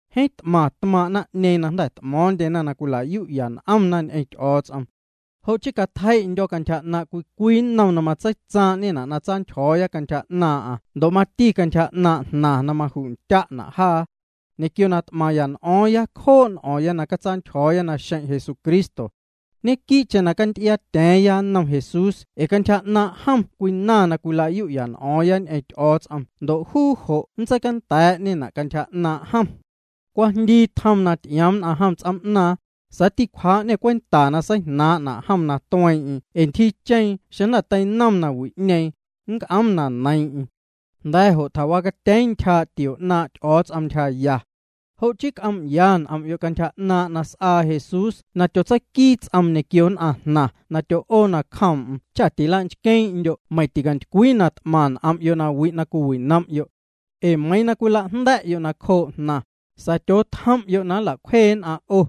Jeeⁿ t'maⁿ tmaaⁿ' naⁿ'ñeeⁿ na jnda̱ t'mo̱o̱ⁿndyena na cwila'yu'ya n'omna ñ'eⁿ Ty'o̱o̱ts'om. Jo' chii catjei'ndyo̱ cantyja 'naaⁿ' cwii cwii nnom na matseitsaaⁿ'ñena' na tsantyjo̱o̱ya cantyja 'naaⁿ'aⁿ ndo' mati cantyja 'naaⁿ' jnaⁿ na maju'tya'na' jaa. Ñequio na t'maⁿya n'o̱o̱ⁿya cjoo' n'o̱o̱ⁿya na nntsantyjo̱o̱ya naxeⁿ' Jesucristo. Ñequii'cheⁿ canty'iaatya̱a̱ⁿya nnom Jesús ee cantyja 'naaⁿ' jom cwinaⁿ na cwila'yu'ya n'o̱o̱ⁿya ñ'eⁿ Ty'o̱o̱ts'om ndo' juu jo' nntseicanda̱a̱'ñena' cantyja 'naaⁿ' jom. Cwajndii tjoom na ty'ioom nn'aⁿ jom ts'oom'naaⁿ, sa̱a̱ ticwjaa'ñê cwenta na seijnaaⁿ'na' jom na tueeⁿ'eⁿ jo' ee ntyjiicheeⁿ xeⁿ jnda̱ teinom nawi'ñeeⁿ, nnc'oom na neiiⁿ'eⁿ. Jnda̱ jo' tjawacatyeeⁿ ntyjaa' tio 'naaⁿ' Ty'o̱o̱ts'om ntyjaya. Jo' chii c'oom'ya n'om'yo' cantyja 'naaⁿ' na s'aa Jesús na tyotseiquii ts'oom ñequio nn'aⁿ jnaⁿ na tyo'oo nacjoom'm cha tila'nchqueeⁿ'ndyo' meiⁿ ticantycwii na t'maⁿ n'om'yo' na wi' na cwiwinom'yo'. Ee meiiⁿ na cwila'jnda̱'yo' nacjoo jnaⁿ, sa̱a̱ tyootjom'yo' na nla'cwjee nn'aⁿ 'o.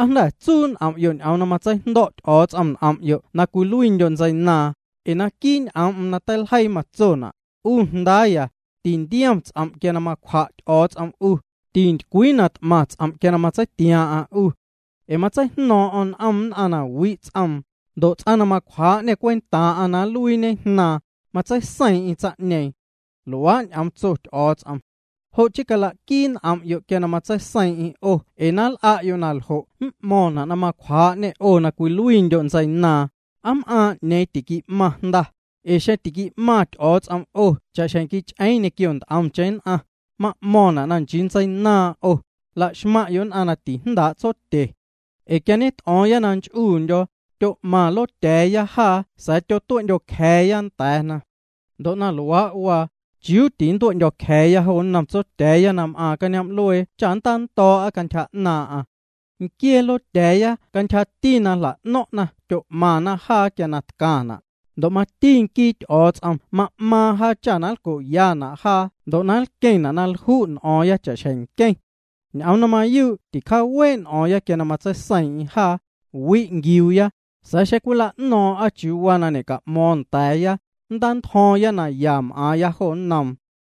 ¿Aa jnda̱ tsuu' n'om'yo' ñ'oom na matseijndo̱' Ty'o̱o̱ts'om n'om'yo' na cwiluiindyo' ntseinaaⁿ? Ee naquii' n'oom'm na teiljeii matsona': 'U jndaaya, tintiom ts'om' quia macwja' Ty'o̱o̱ts'om 'u, tintycwii na t'maⁿ ts'om' quia matseitiaaⁿ'aⁿ 'u. Ee matseijno̱o̱ⁿ'o̱ⁿ n'om nn'aⁿ na wi' ts'oom, ndo' ts'aⁿ na macwjaa'ñê cwentaaⁿ'aⁿ na cwiluiiñe jnaaⁿ, matseiseiiⁿ'eⁿ tsaⁿ'ñeeⁿ. Luaa' ñ'oom tso Ty'o̱o̱ts'om. Jo' chii cala'quii n'om'yo' quia matseiseiiⁿ'eⁿ 'o ee na nl'a'yo' naljo' m'mo̱ⁿna' na macwjaa'ñê na 'o cwiluiindyo' ntseinaaⁿ, ¿aa m'aaⁿ 'ñeeⁿ tiqui'maⁿ jnda? Ee xeⁿ tiqui'maⁿ Ty'o̱o̱ts'om 'o cha'xjeⁿ quich'eeⁿ ñequio nt'omcheⁿ ntseinaaⁿ, ma'mo̱ⁿna' na nchii ntseinaaⁿ 'o, la'xmaⁿ'yo' nn'aⁿ na tijndaa' tsotyena. Ee quia ñet'o̱o̱ⁿya na nch'uundyo̱, tyo'maⁿ lotya̱a̱ya jaa sa̱a̱ tyotue'ndyo̱cja̱a̱ nda̱a̱na. Ndo' na luaa', chiuuti nntue'ndyo̱cja̱a̱ jo nnom Tsotya̱a̱ya na m'aaⁿ cañoom'luee cha nntando̱o̱'a cantyja 'naaⁿ'aⁿ. Nquiee lotya̱a̱ya cantyjati na jla'no̱ⁿ'na tyo'maⁿna jaa quia na tcaⁿna', ndo' mati nquii Ty'o̱o̱ts'om ma'maaⁿ jaa cha nlco'yana' jaa ndo' na nlqueⁿna' na lju' n'o̱o̱ⁿ cha'xjeⁿ nqueⁿ. Ñ'oom na mayuu' ticjaawee' n'o̱o̱ⁿya quia matseiseiiⁿ'eⁿ jaa, wi' nquiuuya, sa̱a̱ xeⁿ cwila'no̱o̱ⁿ'a chiuu waa na ñeca'mo̱o̱ⁿ nda̱a̱ya, nntantyjo̱o̱ⁿya na ya m'aaⁿya jo nnoom.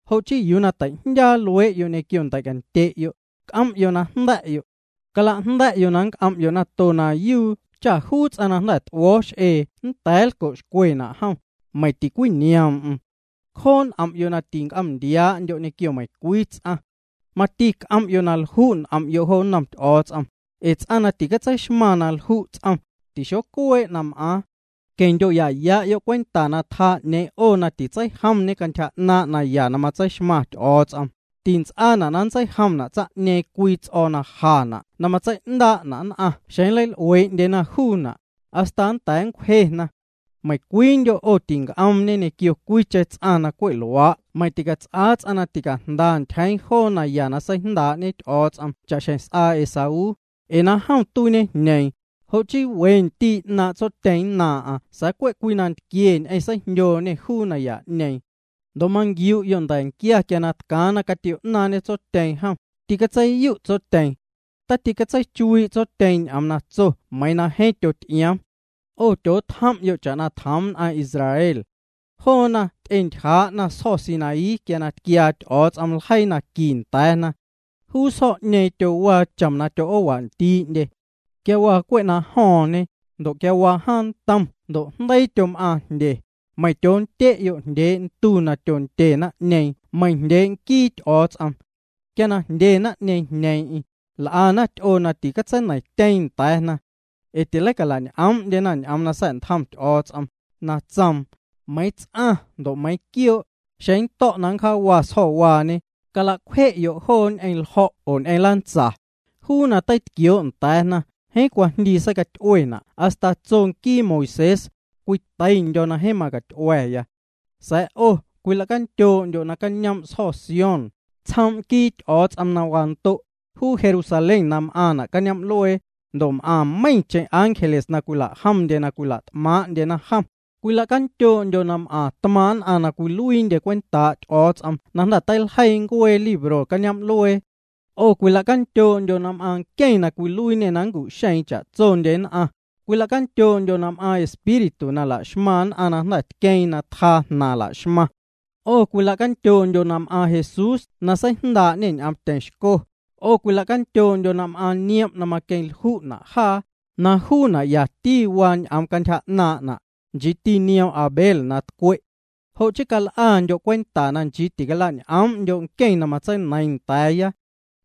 Jo' chii yuu na teijndyaa luee'yo' ñequio ndei'cantye'yo', c'om'yo' na jnda̱'yo'. Cala'jnda̱'yo' na nnc'om'yo' nato yuu cha juu ts'aⁿ na jnda̱ t'uo̱o̱ x'ee nda̱a̱ nlco'xcwena' jom, meiⁿ ticwinioom'm. Cjoo' n'om'yo' na tinc'om'ndiaa'ndyo' ñequio meiⁿcwii ts'aⁿ. Mati c'om'yo' na lju' n'om'yo' jo nnom Ty'o̱o̱ts'om, ee ts'aⁿ na ticatseixmaⁿ na lju' ts'om, tixocuee' na m'aaⁿ. Queⁿ'ndyo'ya'yo' cwenta na tjaa 'ñeeⁿ 'o na titseijomñe cantyja 'naaⁿ' naya na matseixmaⁿ Ty'o̱o̱ts'om, tints'aana' na nntseijomna' tsaⁿ'ñeeⁿ cwii ts'o̱o̱ na jana' na matsei'ndaa'na' nn'aⁿ xeⁿ nleil'uee'ndyena juuna', hasta nnda̱a̱ nncwjena. Meiⁿcwiindyo' 'o tinc'oom'ñe ñequio cwiicheⁿ ts'aⁿ na cwe' luaa' meiⁿ ticats'aa ts'aⁿ na ticajnda ntyjeeⁿ joo naya na seijndaa'ñe Ty'o̱o̱ts'om cha'xjeⁿ s'aa Esaú, ee na jom tuiiñejñeeⁿ, jo' chii we ndii' 'naaⁿ' tsotyeeⁿ nnaaⁿ'aⁿ sa̱a̱ cwe' cwii nantquie ñ'eⁿ seijndyooñê juu naya'ñeeⁿ. Ndo' manquiu'yo' na nda̱nquia quia na tcaaⁿ na catio'naaⁿñe tsotyeeⁿ jom, tîcatseiyu' tsotyeeⁿ. Taticatseichuii' tsotyeeⁿ ñ'oom na tso meiiⁿ na jeeⁿ tyot'ioom. 'O tyootjom'yo' cha'na tjoom nn'aⁿ Israel. Joona ty'entyjaa'na sjo̱ Sinaí quia tquiaa Ty'o̱o̱ts'om ljeii naqui nda̱a̱na. Juu sjo̱'ñeeⁿ tyowaa chom na tyo'oowandii'ndye. Quia waa cwe' na jo̱o̱ⁿñe, quia waa jaaⁿ ntom ndo' jndeii tyom'aaⁿ jndye, meiⁿ tyoondye'yo' jndyee' ntu na tyondye naⁿ'ñeeⁿ meiⁿ jndyee' nquii Ty'o̱o̱ts'om. Quia na jndye naⁿ'ñeeⁿ jñeeⁿ'eⁿ, l'ana ty'oo na tintseineiⁿtyeeⁿ nda̱a̱na. Ee tileicala'ñ'oom'ndyena ñ'oom na sa̱'ntjom Ty'o̱o̱ts'om, na tsoom: “Meiiⁿ ts'aⁿ ndo' meiiⁿ quioo', xeⁿ nnto̱' na nncjaawa sjo̱waañe, cala'cwje'yo' joo ñ'eⁿ ljo̱' oo ñ'eⁿ lantsa.” Juu na teitquioo' nda̱a̱na, jeeⁿ cwajndii seicaty'uena' hasta tso nquii Moisés: “Cwiteindyo̱ na jeeⁿ macaty'ua̱.” Sa̱a̱ 'o cwila'candyoo'ndyo' na m'aaⁿ Sjo̱ Sión, tsjoom' nquii Ty'o̱o̱ts'om na wando', juu Jerusalén na m'aaⁿna' cañoom'luee, ndo' m'aⁿ meiⁿ meiⁿcheⁿ ángeles na cwila'jomndyena na cwila't'maaⁿ'ndyena jom, Cwila'candyoo'ndyo' na m'aⁿ tmaaⁿ' nn'aⁿ na cwiluiindyena cwentaa' Ty'o̱o̱ts'om na jnda̱ teiljeii ncueena libro cañoom'luee. 'O cwila'candyoo'ndyo' na m'aaⁿ nqueⁿ na cwiluiiñê na macu'xeeⁿ cha'tsondye nn'aⁿ, cwila'candyoo'ndyo' na m'aⁿ espíritu na laxmaⁿ nn'aⁿ na jnda̱ tqueeⁿ na tjaa jnaⁿ la'xmaⁿna. 'O cwila'candyoo'ndyo' na m'aaⁿ Jesús na seijndaa'ñê ñ'oomtyeⁿ xco, 'o cwila'candyoo'ndyo' na m'aaⁿ niom' na maqueⁿlju'na' jaa, na juuna' yati waa ñ'oom cantyja 'naaⁿ'na', nchiiti nioom' Abel na tcwe'. Jo' chii cal'andyo' cwenta na nchii na ticala'ñ'oom'ndyo' nqueⁿ na matseineiiⁿ nda̱a̱ya.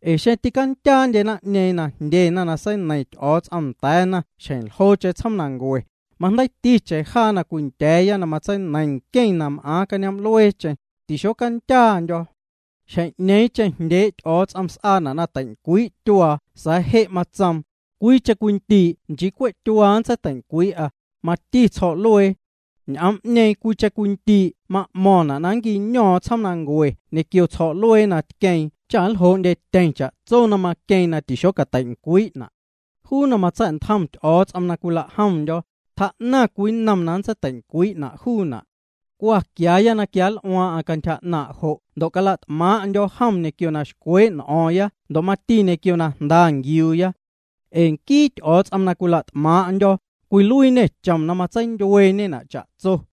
Ee xeⁿ tîcandyaandye naⁿ'ñeeⁿ na jndyena na seineiⁿ Ty'o̱o̱ts'om nda̱a̱na xjeⁿ ljoocheⁿ tsjoomnancue, majndeiiticheⁿ jaa na cwindya̱a̱ na matseineiⁿ nqueⁿ na m'aaⁿ cañoom'lueecheⁿ, tixocandyaandyo̱. Xjeⁿ'ñeeⁿcheⁿ jndyee' Ty'o̱o̱ts'om s'aana' na teincwii' tyuaa sa̱a̱ je' matsoom: “Cwiicheⁿ cwii ndii' nchii cwe' nntseiteincwii'a tyuaa, mati tsjo̱'luee.” Ñ'oom'ñeeⁿ “cwiicheⁿ cwii ndii'” ma'mo̱ⁿna' na nquiño̱o̱ⁿ tsjoomnancue ñequio tsjo̱'luee na tqueeⁿ cha nljoo'ndyetyeⁿ cha'tso na maqueeⁿ na tixocateincwii'na'. Juu na matsa̱'ntjom Ty'o̱o̱ts'om na cwila'jomndyo̱, tjaa'naⁿ cwii nnom na nntseiteincwii'na' juuna'. Cwa quiaaya na quianl'uaaⁿ'aⁿ cantyja 'naaⁿ jo' ndo' cala't'maaⁿ'ndyo̱ jom ñequio na xcwee' n'o̱o̱ⁿya ndo' mati ñequio na jnda nquiuuya. Ee nquii Ty'o̱o̱ts'om na cwila't'maaⁿ'ndyo̱, cwiluiiñê chom na matseindyueeñena' cha'tso.